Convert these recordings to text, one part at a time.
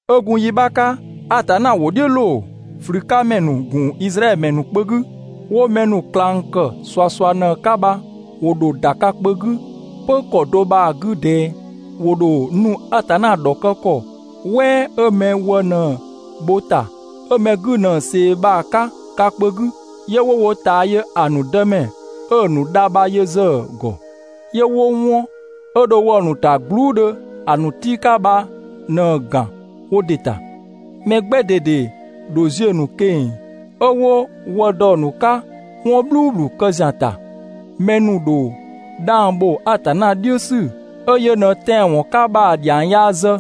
'Ö gun yi 'bha 'ka, Atanna ‑wʋ "dhiʋ̈ ꞊loo ꞊flü 'ka ‑mɛ ‑nu ‑gun Izraɛdhö ‑mɛ ‑nu kpö 'gü, ꞊flümɛ ‑nu 'wo mɛ ‑nu ꞊klang ‑kë ꞊suasua 'ka bha ‑wo ‑dho ‑da ka kpö 'gü 'pö ‑kɔ do bha‑ 'gü ꞊dɛɛ. ‑Wo ‑dho nu Atanna ‑dhɔkë ‑kɔ "wɛɛ 'ö mɛ wë ꞊në‑ bho‑ ‑ta, 'ö mɛ 'gü ꞊në ꞊see bha‑ 'ka ka kpö 'gü 'yö 'wo wo ꞊taa yö‑ ‑nu Dëmɛ 'ö‑ ‑nu dha bha yö ‑zë ‑gɔ, 'yö 'wo 'wɔn 'ö dho wɔ‑ ‑nu ‑ta gbluu" dhö ‑a ‑nu tii' 'ka bha ꞊në‑ ‑gan wo ‑dɩ ‑ta. Mɛ 'gbɛ ꞊dede ‑dho ziö‑ ‑nu ꞊keng‑ 'ö 'wo wë dɔ‑ ‑nu 'ka 'wɔn "bhluubhlu kë ‑zian ‑ta. Mɛ ‑nu ‑dho 'dhang ‑bho Atanna "dhiʋ̈ ‑sü 'ö yö ꞊në tɛanwɔn 'ka bha‑ ‑dhiang yaa zë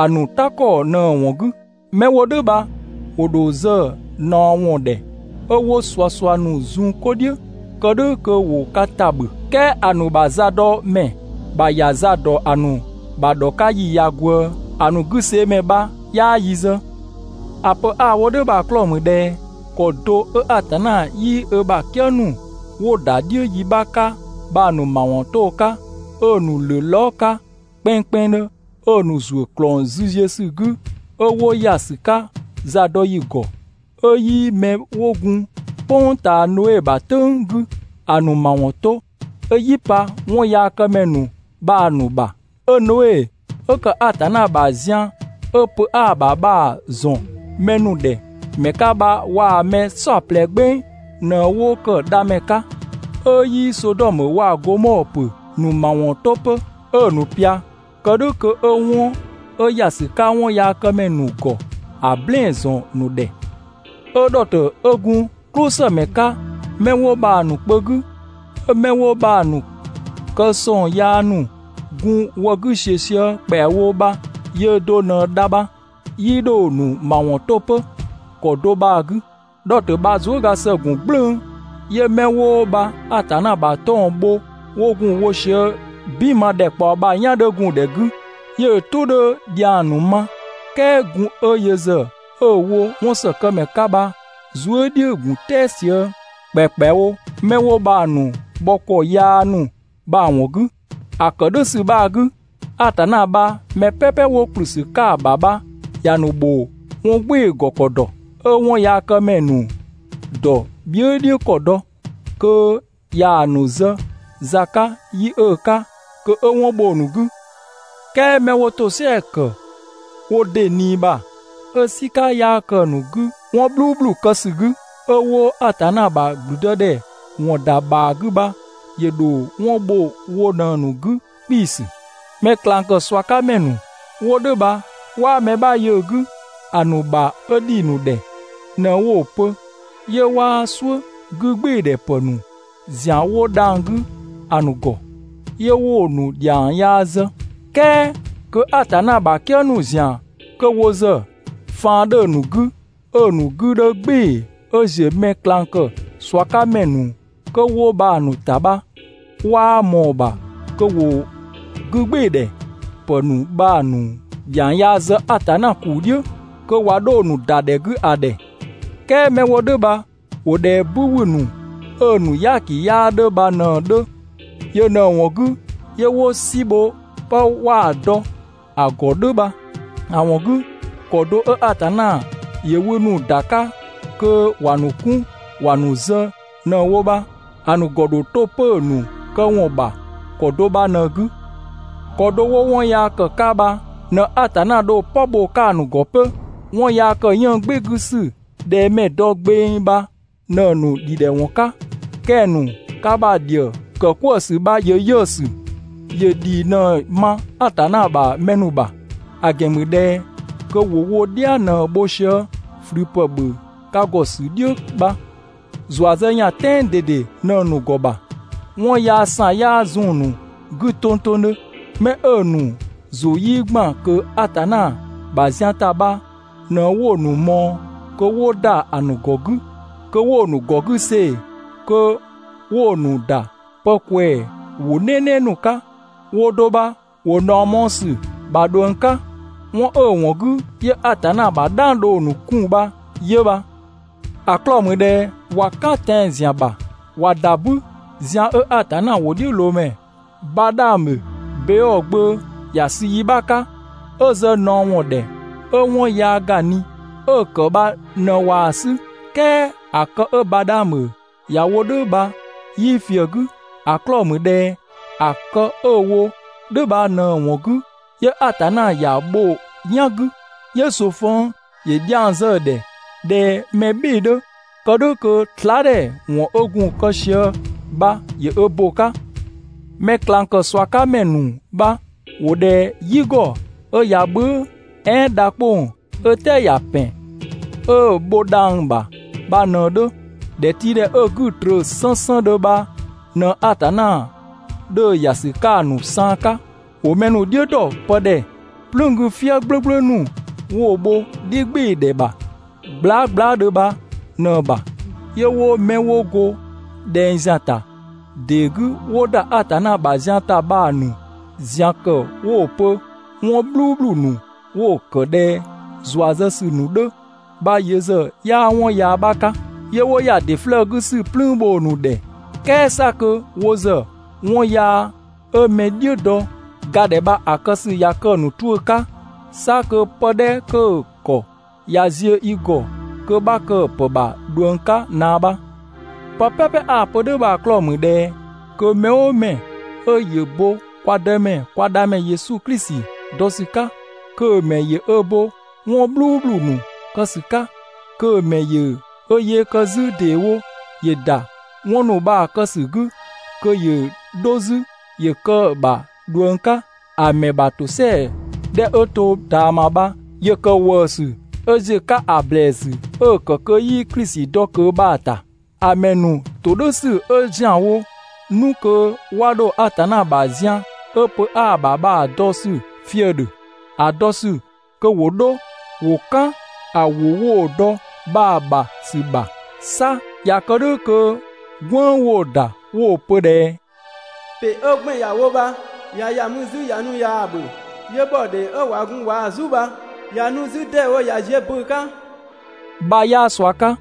‑a ‑nu "ta ‑kɔ ꞊në‑ ‑wɔn 'gü. 'Mɛ 'wo "dhʋ̈ bha ‑wo ‑dho zë ꞊naɔ ‑wɔn ‑dhɛ 'ö 'wo ꞊suasua ‑nu zun 'ko "dhiʋ̈ kë "dhʋ̈ kö 'wo ka ‑ta ‑bhö. "Kɛɛ ‑a ‑nu ‑bha zadɔmɛ ‑bha ‑ya za ‑dɔ ‑a ‑nu ‑bha ‑dhɔ 'ka ‑yi ꞊ya ꞊gwëë. ‑A ‑nu 'güseemɛ bha 'yaa yi zë. ‑A pö 'a‑ wo "dhʋ̈ bha‑ 'klɔɔ‑ ‑mü ꞊dhɛ ‑kɔ do 'ö Atanna 'yii ö ‑bha "kië ‑nu 'wo ‑da "dhiʋ̈ yi 'bha 'ka bha‑ ‑nu ‑mawɔn 'to‑ 'ka, 'ö‑ ‑nu ‑lö lɔɔ" 'ka kpɛnngkpɛnngdhö, 'ö‑ ‑nu ‑zuö ‑klɔng züziösü 'gü 'ö 'wo ‑ya ‑sü 'ka zadɔyi ‑gɔ, 'ö 'yii 'mɛ 'wo gun "kpʋng ꞊taa Noe ‑bha "tʋ̈ng 'gü ‑a ‑nu ‑mawɔn 'to, 'ö "yi pa 'wɔnyaakëmɛ ‑nu bha‑ ‑nu ‑bha, 'ö Noe 'ö ‑kë Atanna ‑bha zian 'ö pö 'aa‑ ‑bha bha‑ ‑zɔn mɛ ‑nu ‑dhɛ ‑mɛ 'ka bha waa‑ mɛ "saɔplɛ "gbeng ꞊në 'wo ‑kë dhamɛ 'ka, 'ö 'yii Sodɔmö waa‑ Gomɔɔ ‑pö ‑nu ‑mawɔn 'to 'pö, 'ö‑ ‑nu ꞊pia kë "dhʋ̈ kö 'ö 'wɔn 'ö ‑ya ‑sü 'ka 'wɔnyaakëmɛ ‑nu ‑gɔ ‑a "blɛɛn‑ ‑zɔn ‑nu ‑dhɛ, 'ö Dhɔtö 'ö gun "klʋsëmɛ 'ka 'mɛ 'wo bha‑ ‑nu kpö 'gü, 'ö 'mɛ 'wo bha‑ ‑nu kë ꞊sɔng yaa ‑nu gun‑ wë 'gü ‑siö sië ‑kpɛawo bha yöö do ꞊në dha bha, ('yii 'dho‑ ‑nu ‑mawɔn 'to 'pö) ‑kɔ do bha‑ 'gü. Dhɔtö bha zuëga ‑së ‑gun "gblʋ̈ʋ̈‑, yö 'mɛ 'wo bha Atanna ‑bha 'tɔng‑ bho 'wo gun‑ wo sië "bin ma ‑dhɛkpaɔ bha‑ "yan 'dhö gun‑ ‑dhɛ 'gü, 'yö‑ "tʋ 'dhö‑ ‑dhiang ‑nu ma, "kɛɛ gun 'ö yö ‑zë 'ö‑ wo 'wɔnsëkëmɛ 'ka bha‑ zuë" "dhiʋ̈‑ ‑gun "tɛɛ sië ‑kpɛakpɛawo 'mɛ 'wo bha‑ ‑nu bhɔ ‑kɔ yaa ‑nu bha‑ ‑wɔn 'gü. ‑A ‑kë "dhʋ̈ ‑sü bha‑ 'gü, Atanna bha mɛ "pɛpɛ 'wo ‑kplü ‑sü 'ka‑ ‑bha bha ‑ya ‑nu ‑bho 'wɔn "gbɩɩ‑ ‑gɔ ‑kɔ ‑dɔ, 'ö 'wɔnyaakëmɛ ‑nu ‑dɔ bhië" "dhiʋ̈ ‑kɔ dɔ, kö 'ya‑ ‑nu zë za 'ka yi 'ö‑ 'ka kö 'ö 'wɔn bho‑ ‑nu 'gü. "Kɛɛ 'mɛ 'wo ‑tosɛa ‑kë wo ‑dɩ ꞊nii ‑bha 'ö "sika 'yaa ke‑ ‑nu 'gü 'wɔn "bhluubhlu kë ‑sü 'gü, 'ö 'wo Atanna ‑bha ‑gblüdëdhɛ ‑wɔn ‑da ‑bhaa 'gü bha, ‑yö ‑dho 'wɔn bho wo ꞊në‑ ‑nu 'gü 'kpiisü. Mɛ ꞊klang ‑kë ꞊sua 'ka ‑mɛ ‑nu 'wo "dhʋ̈ bha 'waa mɛ 'bha yö‑ 'gü, ‑a ‑nu ‑bha 'ö ‑dhi ‑nu ‑dhɛ ꞊në 'wo‑ pö, 'yö 'waa "suʋ̈ 'gügbɩɩdhɛ ‑pë ‑nu ‑zian 'wo dhang‑ 'gü ‑a ‑nu ‑gɔ, 'yö 'wo‑ ‑nu ‑dhiang yaa zë. "kɛɛ kö Atanna ‑bha "kië ‑nu ‑zian 'kö wo ‑zë faan 'dhö‑ ‑nu 'gü 'ö‑ ‑nu 'gü 'dhö "gbɩɩ‑ 'ö ‑ziö mɛ ꞊klang ‑kë ꞊sua 'ka ‑mɛ ‑nu kö 'wo bha‑ ‑nu ‑ta bha, 'waa ꞊mɔɔ‑ ‑bha kö ‑wo 'gügbɩɩdhɛ ‑pë ‑nu bha‑ ‑nu ‑dhiang yaa zë Atanna ‑kuu "dhiʋ̈ kö ꞊wa 'dho‑ ‑nu ‑da ‑dhɛ 'gü ‑a ‑dhɛ. "Kɛɛ 'mɛ 'wo "dhʋ̈ bha ‑wo ꞊dhɛ "bü ‑wü ‑nu 'ö‑ ‑nu "yaaki 'yaa 'dhö bha ꞊në‑ 'dhö, yö ꞊në‑ ‑wɔn 'gü 'yö 'wo "si bho 'pë 'waa dɔ ‑a ‑gɔ "dhʋ̈ bha. ‑A ‑wɔn 'gü, ‑kɔ do 'ö Atanna ‑yö wü ‑nu ‑da 'ka kö ‑wa ‑nu 'kun ‑wa ‑nu zë ꞊në‑ wo bha, ‑a ‑nu ‑gɔ ‑dho 'to 'pö‑ ‑nu këwɔn ‑bha ‑kɔ do bha ꞊në‑ 'gü. ‑Kɔ do 'wo 'wɔn yaa ‑kë 'ka bha ꞊në Atanna dho‑ "pɔ bho‑ 'ka‑ ‑nu ‑gɔ 'pö. 'Wɔn yaa ‑kë 'yënng‑ "gbɩɩ‑ 'gü ‑sü ꞊dhɛ mɛ‑ dɔ gbeng bha ꞊në‑ ‑nu ‑dhidhɛwɔn 'ka, kɛng‑ ‑nu ka ‑bha ‑dhië ‑kë "kwëë ‑sü bha ‑yö 'yiʋ̈‑ ‑sü, ‑yö ‑dhii ꞊në‑ ma Atanna ‑bha mɛ ‑nu ‑bha. ‑A ‑gɛn ‑mü ꞊dhɛ kö ‑wo wo "dhia ꞊në bho sië ꞊flü ‑pë ‑bhö ka ‑gɔ ‑sü "dhiʋ̈ bha. ‑Zua zë ‑yan "tɛɛn ꞊dede ꞊në‑ ‑nu ‑gɔ ‑bha, 'wɔn yaa ‑san 'yaa zun‑ ‑nu 'gü tongtongdhö. 'Mɛ 'ö‑ ‑nu ‑zʋ 'yii ‑gban ꞊kö Atanna ‑bha zian ‑ta bha ꞊në 'wo‑ ‑nu ꞊mɔɔ kö 'wo ‑da ‑a ‑nu ‑gɔ 'gü kö 'wo‑ ‑nu ‑gɔ 'gü see‑, kö 'wo‑ ‑nu ‑da pë ꞊kwɛɛ ‑wʋ "nɛɛnɛɛ ‑nu 'ka, woo‑ do bha ‑wo ꞊naɔ mɔɔ‑ ‑sü ‑bha ꞊dhuëng 'ka. 'Wɔn 'ö‑ ‑wɔn 'gü 'yö Atanna ‑bha "dhang dho‑ ‑nu 'kun bha 'yö bha. ‑A 'klɔɔ‑ ‑mü ꞊dhɛ ꞊wa "kan tɛan‑ ‑zian ‑bha ꞊wa ‑da "bü, zian 'ö Atanna ‑wʋdhiʋ̈loomɛ Badhaamö, Beɔɔ gbö ‑ya sü yi 'bha 'ka, 'ö zë ꞊naɔ ‑wɔn ‑dhɛ 'ö 'wɔn yaa ‑ga ꞊ni, 'ö‑ ‑kë bha ꞊në ꞊waa‑ 'sü. "Kɛɛ ‑a kë 'ö Badhaamö ‑ya wo "dhʋ̈ bha 'yii ꞊fië‑ 'gü. ‑A 'klɔɔ‑ ‑mü ꞊dhɛ ‑a kë 'ö‑ wo "dhʋ̈ bha ꞊në‑ ‑wɔn 'gü 'yö Atanna ‑ya bho‑ "yan 'gü, 'yö ꞊soofëng ‑yö dhiang zë‑ ‑dhɛ ꞊dhɛ mɛ "bhɩɩ‑ 'dhö, kë "dhʋ̈ kö slaadhɛ ‑wɔn 'ö gun‑ kë sië bha ‑yö ö bo‑ 'ka. Mɛ ꞊klang ‑kë ꞊sua 'ka ‑mɛ ‑nu bha ‑wo ꞊dhɛ "yi ‑gɔ 'ö ꞊ya "bhʋ̈ʋ̈, "ɛɛn dha 'kpong‑ 'ö "tɛɛ ‑ya ‑pɛn 'ö‑ bho dhang‑ ‑bha bha ꞊në‑ 'dhö. ‑Dhɛtiidhɛ 'ö‑ 'gü‑ ꞊tröö 'sënsëndhö bha ꞊në Atanna 'dhö‑ ‑ya ‑sü 'ka‑ ‑nu saan 'ka. ‑Wo mɛ ‑nu "dhiʋ̈ ‑dɔ pë ‑dhɛ "plüün 'gü "fië "gblʋ̈gblʋ̈ ‑nu 'wo‑ bho "dhi "gbɩɩ‑ ‑dhɛ bha glaa" glaadhö bha ꞊në‑ ‑bha, 'yö 'wo 'mɛ 'wo go ꞊dhɛng ‑zian ‑ta ‑dee 'gü 'wo ‑da Atanna ‑bha zian ‑ta bha‑ ‑nu ‑zian ‑kë 'wo‑ pö 'wɔn "bhluubhlu ‑nu 'wo‑ ‑kë ꞊dhɛ ‑zua zë ‑sü ‑nu 'dhö bha yö ‑zë 'yaa 'wɔn 'bha 'ka. 'Yö 'wo ‑ya ‑dɩ 'flëë‑ 'gü ‑sü "plüün bho‑ ‑nu ‑dhɛ "kɛɛ 'sa kö wo ‑zë 'wɔn yaa 'ö mɛ "dhiʋ̈ dɔ ga ‑dhɛ bha‑ kë ‑sü ꞊ya kë‑ ‑nu 'tuʋ̈‑ 'ka, 'sa kö pë 'dhɛ kö‑ ‑kɔ ꞊ya ziö i ‑gɔ kö 'bha kë‑ ‑pë ‑bha ꞊dhuëng 'ka ꞊naa bha. Pë "pɛpɛ 'a‑ pö "dhʋ̈ bha‑ 'klɔɔ‑ ‑mü ꞊dhɛ kö mɛ "ʋʋ mɛ 'ö ‑yö bo kwa Dëmɛ kwa Dhamɛ Yesu Klisi dɔ ‑sü 'ka, kö‑ ‑mɛ ‑yö ö bo 'wɔn "bhluubhlu ‑nu kë ‑sü 'ka, kö‑ mɛ ‑yö ö yee kë 'zü ‑deewo ‑yö ‑da 'wɔn ‑nu bha‑ kë ‑sü 'gü, kö ‑yö 'dho 'zü ‑yö kë‑ ‑bha ꞊dhuëng 'ka, ‑a ‑mɛ ‑bha ‑tosɛa 'dhɛ 'ö to ꞊taama bha ‑yö ‑kë ‑wëësü 'ö ‑ziö 'ka ‑a ‑blɛɛsü 'ö‑ ‑kë kö 'yii Klisi dɔ ꞊kö bha‑ ‑ta. ‑A ‑mɛ ‑nu ‑todhʋ̈sü 'ö ‑zianwo 'nu kö 'wa 'dho Atanna ‑bha zian 'ö pö 'aa‑ ‑bha bha‑ dɔ ‑sü fië‑ ‑dhö, ‑a dɔ ‑sü kö ‑wo 'dho ‑wo "kan‑ ‑wʋ 'wo‑ dɔ bha‑ ‑bha ‑sü ‑bha. 'Sa ꞊ya kë "dhʋ̈ kö "gwënng 'wo‑ ‑da 'wo‑ pö ꞊dhɛ: «‑Pɩ 'ö 'gbɛn‑ ‑ya wo bha ꞊ya ‑ya 'zü mü ꞊ya nu ꞊yaa‑ ‑bhö, 'yö ‑bhɔ ‑dhee 'ö ꞊wa gun ꞊waa‑ "zu bha ꞊ya nu 'zü ‑deewo ꞊ya ziö böö‑ 'ka» bha 'yaa ꞊sua 'ka.